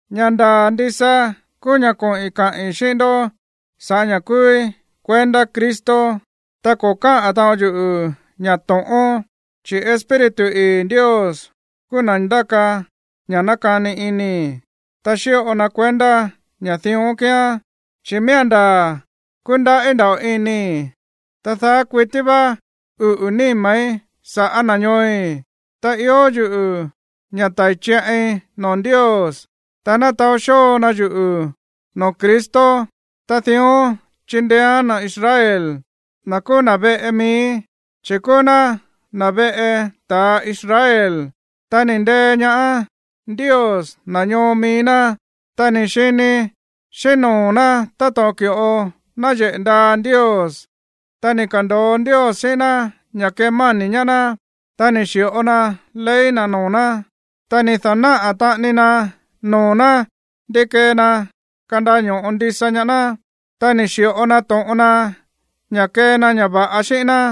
Ña̱ ndaa̱ ndisa kúú ña̱ koꞌi̱n kaꞌi̱n xíꞌín ndó sa̱ꞌá ña̱ kúúí kuendá Cristo. Ta ko̱ káꞌa̱n taꞌon yuꞌu̱ ña̱ to̱ꞌón, chi̱ Espíritu ii̱ Ndios kúú na̱ ndáka ña̱ nákani inii̱, ta xíꞌo na kuendá ña̱ dión kíán. Chi̱ miía̱n ndaa̱ kúndaꞌí nda̱ꞌo inii̱, ta daá kuití vá uꞌu̱ níma̱í sa̱ꞌá na̱ ñooi̱. Ta ió yuꞌu̱ ña̱ tai̱ chiꞌain noo̱ Ndios, ta nataó xóo na yuꞌu̱ noo̱ Cristo tá dión chindeéán na̱ Israel, na̱ kúú na̱ veꞌe miíí. Chi̱ kúú ná na̱ veꞌe ta̱ Israel, ta ni̱ ndee ñaá Ndios na̱ ñoo mií ná, ta ni̱ xini xíꞌín noo̱ ná táto̱ꞌon ki̱ꞌo náyeꞌe̱ ndaa Ndios, ta ni̱ ka̱ndo̱o Ndios xíꞌín ná ña̱ kemáni̱ ñaá ná, ta ni̱ xi̱ꞌo na ley na̱ noo̱ ná, ta ni̱ da̱náꞌa̱ taꞌani na noo̱ ná ndi kee na kandaño̱ꞌo ndisa ñaá ná, ta ni̱ xi̱ꞌo na to̱ꞌon na ña̱ kee na ña̱ va̱ꞌa xíꞌín ná.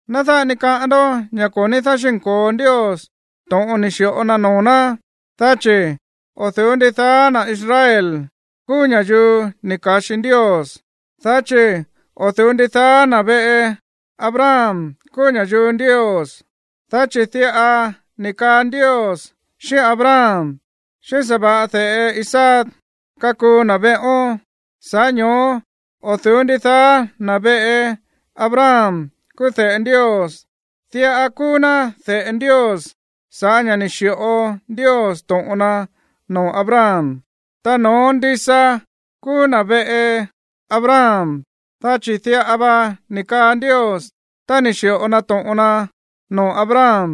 Ná dáꞌa ni kaꞌán ndó ña̱ ko̱ ní dáxínko̱o Ndios to̱ꞌon ni̱ xi̱ꞌo na noo̱ ná, dá chi̱ o̱ du̱ú ndidaá na̱ Israel kúú ña̱yuu ni̱ ka̱xi Ndios. Dá chi̱ o̱ du̱ú ndidaá na̱ veꞌe Abraham kúú ña̱yuu Ndios, dá chi̱ diꞌa ni̱ kaa Ndios xíꞌín Abraham: “Xíꞌín sa̱va̱ꞌa de̱ꞌe Isaac kakuu na̱ veꞌón.” Sa̱ꞌá ño̱ó o̱ du̱ú ndidaá na̱ veꞌe Abraham kúú de̱ꞌe Ndios. Diꞌa kúú ná de̱ꞌe Ndios sa̱ꞌá ña̱ ni̱ xi̱ꞌo Ndios to̱ꞌon na noo̱ Abraham, ta no̱ón ndisa kúú na̱ veꞌe Abraham. Dá chi̱ diꞌa va ni̱ kaa Ndios tá ni̱ xi̱ꞌo na to̱ꞌon na noo̱ Abraham: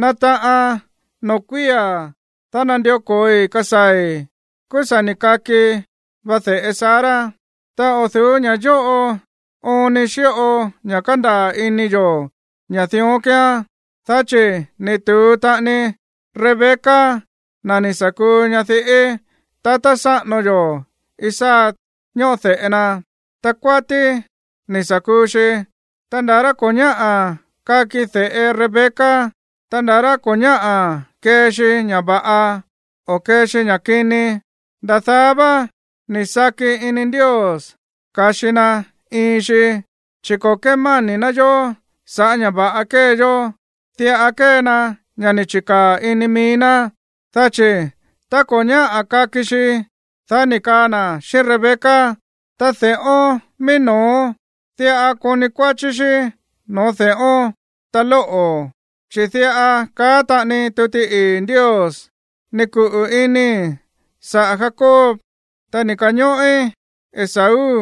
“Nataꞌan noo̱ kuía̱, dá nandió ko̱oi kasaa̱i̱, kúú sa̱ ni̱ kaki va de̱ꞌe Sara.” Ta o̱ du̱ú ña̱ yóꞌo oon ni xíꞌo ña̱ kándaa̱ ini yo̱ ña̱ dión kíán. Dá chi̱ ni̱ tu̱u taꞌani Rebeca, na̱ ni̱ sa̱ kuu ñadiꞌí tatá sáꞌano yo̱ Isaac, ñóꞌo de̱ꞌe na, ta kuátí ni̱ sa̱ kuu xi. Ta nda̱ rá ko̱ ñáꞌa̱ kaki de̱ꞌe Rebeca, ta nda̱ rá ko̱ ñáꞌa̱ kee xi ña̱ va̱ꞌa, o kee xi ña̱ kini, nda̱ daá vá ni̱ saki ini Ndios ka̱xi na iin xi. Chi̱ ko̱ kémáni̱ ná yó sa̱ꞌá ña̱ va̱ꞌa kée yó, diꞌa kée na ña̱ ni̱ chi̱kaa̱ ini mií ná. Dá chi̱ tá ko̱ ñáꞌa̱ kaki xi, dá ni̱ kaa na̱ xíꞌín Rebeca: “Ta de̱ꞌón mií no̱ó, diꞌa koni kuáchí xí no̱ó de̱ꞌón ta lóꞌo̱.” Chi̱ diꞌa kaá taꞌani tuti ii̱ Ndios: “Ni̱ kuꞌu̱ inii̱ saꞌa̱ Jacob, ta ni̱ ka̱ñóꞌí Esaú.”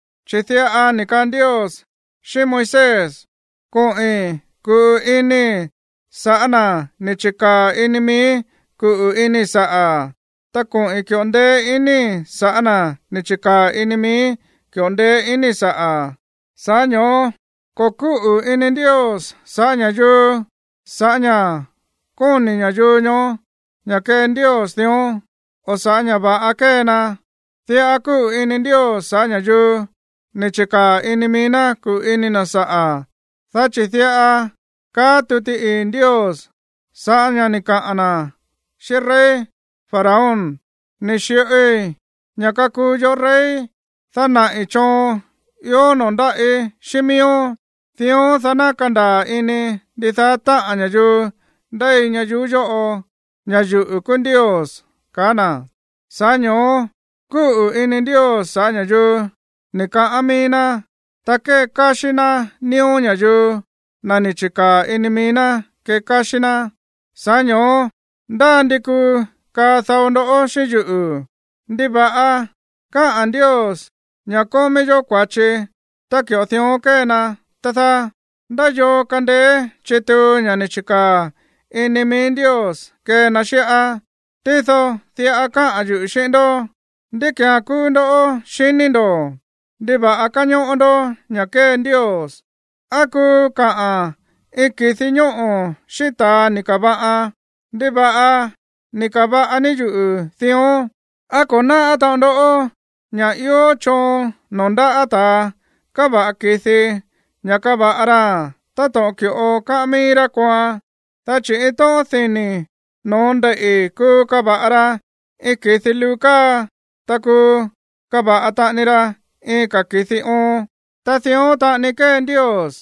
Chi̱ diꞌa ni̱ kaa Ndios xíꞌín Moisés: “Koꞌi̱n kuꞌu̱ inii̱ sa̱ꞌá na̱ ni̱ chi̱kaa̱ ini miíí kuꞌu̱ ini saꞌa̱, ta koꞌi̱n ki̱ꞌo ndeé inii̱ sa̱ꞌá na̱ ni̱ chi̱kaa̱ ini miíí ki̱ꞌo ndeé ini saꞌa̱.” Sa̱ꞌá ño̱ó ko̱ kúꞌu̱ ini Ndios sa̱ꞌá ña̱yuu sa̱ꞌá ña̱ kóni̱ ña̱yuu ñoó ña̱ kee Ndios dión, o sa̱ꞌá ña̱ va̱ꞌa kée na. Diꞌa kúꞌu̱ ini Ndios sa̱ꞌá ña̱yuu ni̱ chi̱kaa̱ ini mií ná kuꞌu̱ ini na̱ saꞌa̱. Dá chi̱ diꞌa káꞌa̱n tuti ii̱ Ndios sa̱ꞌá ña̱ ni̱ kaꞌa̱n na̱ xíꞌín rey Faraón: “Ni̱ xi̱ꞌoi ña̱ kakuu yoꞌó rey, dá naꞌi̱ choon ió noo̱ ndáꞌí xíꞌín miíón, dión, dá ná kandaa̱ ini ndidaá táꞌa̱n ña̱yuu ndéi ñayuú yóꞌo ña̱ yuꞌu̱ kúú Ndios”, kaá na̱. Sa̱ꞌá ño̱ó kúꞌu̱ ini Ndios sa̱ꞌá ña̱yuu ni̱ kaꞌán mií ná, ta kékáxí ná nío̱ ña̱yuu, na̱ ni̱ chi̱kaa̱ ini mií ná kekáxí ná. Sa̱ꞌá ño̱ó, ndá ndi kuu kaa dao ndoꞌó xíꞌín yuꞌu̱: “¿Ndiva̱ꞌa káꞌa̱n Ndios ña̱ kómí yó kua̱chi tá ki̱ꞌo dión kée na, tá dáá? ¿Ndá yoo kandeé chituu ña̱ ni̱ chi̱kaa̱ ini mií Ndios kee na xíꞌá?” Tído diꞌa kaá yuꞌu̱ xíꞌín ndó: ¿Ndí ki̱án kúú ndoꞌó, xiní ndo̱? ¿Ndiva̱ꞌa káñóꞌó ndó ña̱ kée Ndios? ¿Á kuu kaꞌa̱n iin ki̱di ñóꞌo̱ xíꞌín ta̱a ni̱ ka̱va̱ꞌan: “¿Ndiva̱ꞌa ni̱ ka̱va̱ꞌa ní yuꞌu̱ dión?” ¿Á ko̱ náꞌá taꞌon ndoꞌó ña̱ ió choon noo̱ ndáꞌa̱ ta̱a káva̱ꞌa ki̱di ña̱ kava̱ꞌa raa̱n táto̱ꞌon ki̱ꞌo káꞌán mií rá kooan? Dá chi̱ iin tóꞌón dini̱ no̱ó ndeiꞌi̱ kuu va kava̱ꞌa ra iin ki̱di luu káa, ta kuu kava̱ꞌa taꞌani ra iin ka̱ ki̱di oon. Ta dión taꞌani kée Ndios,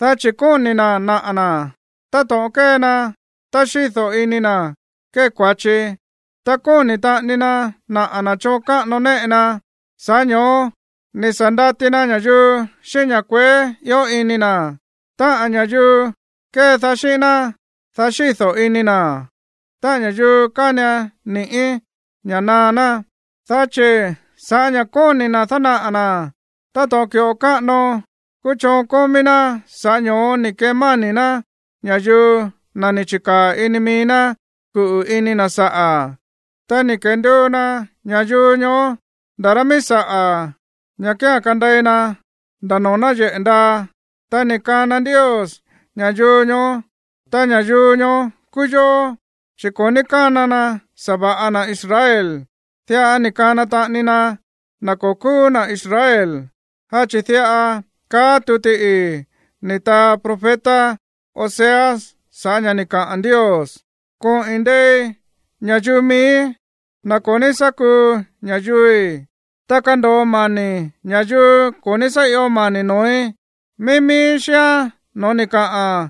dá chi̱ kóni̱ na̱ naꞌa̱ na̱ táto̱ꞌon kée na tá xído̱ ini na̱ kée kua̱chi, ta kóni̱ taꞌani na naꞌa̱ na̱ choon káꞌano néꞌe na, sa̱ꞌá ño̱ó ni̱ sa̱ ndati na ña̱yuu xíꞌín ña̱ kueé ió ini na̱, táꞌa̱n ña̱yuu kédaá xíꞌín ná, dá xído̱ ini na̱, táꞌa̱n ña̱yuu kánian ni̱ꞌí ña̱ naá ná. Dá chi̱ sa̱ꞌá ña̱ kóni̱ na̱ dánaꞌa̱ na̱ táto̱ꞌon ki̱ꞌo káꞌano kúú choon kómí ná, sa̱ꞌá ño̱ó ni̱ kemáni̱ ná ña̱yuu, na̱ ni̱ chi̱kaa̱ ini mií ná kuꞌu̱ ini na̱ saꞌa̱, ta ni̱ kenduu na̱ ña̱yuu ñoó nda̱ rá míí saꞌa̱ ña̱ kía̱n kandei na nda̱ noo̱ náyeꞌe̱ ndaa. Ta ni̱ kana Ndios ña̱yuu ñoó, ta ña̱yuu ñoó kúú yó, chi̱ ko̱ ní kána na sa̱va̱ꞌa na̱ Israel, diꞌa ni̱ kana taꞌani na na̱ ko̱ kúú na̱ Israel. Dá chi̱ diꞌa káꞌa̱n tuti ni̱ taa profeta Oseas sa̱ꞌá ña̱ ni̱ kaꞌa̱n Ndios: Koꞌi̱n ndeei ña̱yuu miíí, na̱ ko̱ ní sá kuu ña̱yuui̱, ta kando̱o mani̱ ña̱yuu ko̱ ní sá io mani̱ noo̱í. Mií mií xíán noo̱ ni̱ kaꞌa̱n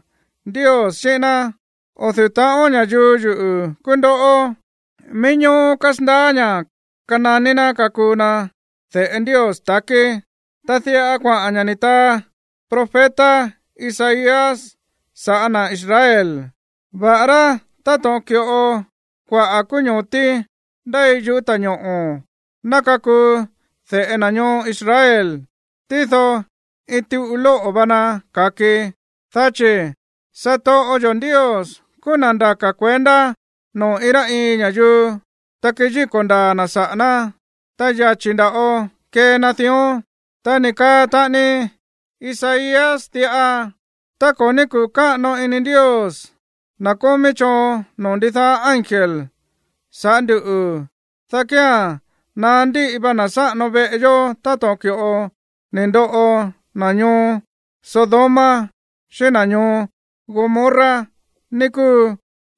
Ndios xíꞌín ná: “O̱ du̱ú ta̱ꞌón ña̱yuu yuꞌu̱ kúú ndoꞌó”, mií ñoó kasandaá ña̱ kananí ná kakuu na de̱ꞌe Ndios ta̱kí. Ta diꞌa kuaꞌa̱n ña̱ ni̱ taa profeta Isaías sa̱ꞌá na̱ Israel: “Va̱ꞌará táto̱ꞌon ki̱ꞌo kuaꞌa̱ kúú ño̱tí ndéi yuꞌú ta̱ñoꞌo̱ ná kakuu de̱ꞌe na̱ ñoo Israel, tído iin tuꞌu lóꞌo̱ va na ka̱ki. Dá chi̱ satoꞌo yo̱ Ndios kúú na̱ ndaka̱ kuendá noo̱ iin rá iin ña̱yuu, ta keyíko̱ ndaa̱ na̱ saꞌa̱ ná, ta yachi̱ nda̱ꞌo kee na dión.” Ta ni̱ kaa taꞌani Isaías diꞌa: Tá ko̱ ní kuꞌu̱ káꞌano ini Ndios, na̱ kómí choon noo̱ ndidaá ángel, sa̱ꞌá nduꞌu̱, dá kía̱n naá ndíꞌi va na̱ sáꞌano veꞌe yó táto̱ꞌon ki̱ꞌo ni̱ ndoꞌo na̱ ñoo Sodoma xíꞌín na̱ ñoo Gomorra, ní kúu.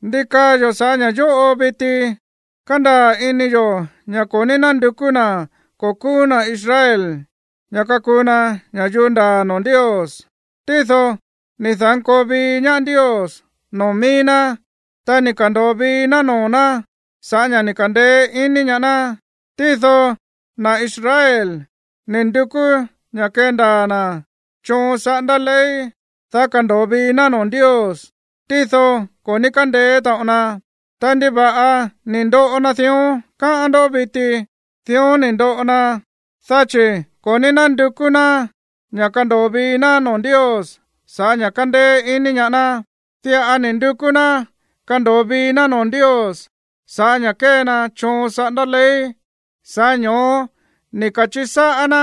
¿Ndi kaa yo̱ sa̱ꞌá ña̱ yóꞌo, viti? Kándaa̱ ini yo̱ ña̱ ko̱ ní nándukú na̱ ko̱ kúú na̱ Israel ña̱ kakuu na ña̱yuu ndaa̱ noo̱ Ndios, tído ni̱ da̱nkoo vii ñaá Ndios noo̱ míí ná, ta ni̱ ka̱ndo̱o vii ná noo̱ ná sa̱ꞌá ña̱ ni̱ ka̱ndeé ini ñaá ná. Tído na̱ Israel ni̱ ndukú ña̱ kendaa̱ na̱ choon saꞌándá ley, dá kando̱o vii ná noo̱ Ndios. Tído ko̱ ní kándeé taꞌon na. Ta, ¿ndiva̱ꞌa ni̱ ndoꞌo na dión, káꞌán ndó viti? Dión ni̱ ndoꞌo na, dá chi̱ ko̱ ní nándukú ná ña̱ kando̱o vii ná noo̱ Ndios sa̱ꞌá ña̱ kandeé iní ñaá ná. Diꞌa ni̱ ndukú ná kando̱o vii ná noo̱ Ndios sa̱ꞌá ña̱ kée na choon saꞌándá ley. Sa̱ꞌá ño̱ó ni̱ ka̱chiꞌi sáꞌá ná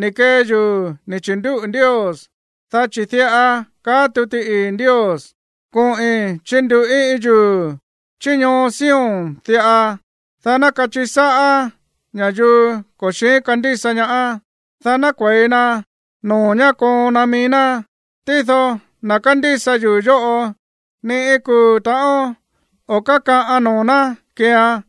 ni̱ kee yuu̱ ni̱ chi̱ndúꞌu̱ Ndios. Dá chi̱ diꞌa kaá tuti ii̱ Ndios: Koꞌi̱n chindu̱ꞌí iin yuu̱ chí ñoo Sion diꞌa, dá ná kachiꞌi sáꞌá ña̱yuu ko̱ xi̱ín kandísa ñaá, dá ná kue̱i na no̱ó ña̱ koon na mií ná. Tído na̱ kándísa yuu̱ yóꞌo, ni iin kuu̱ ta̱ꞌón o̱ kákaꞌan noo̱ ná keean.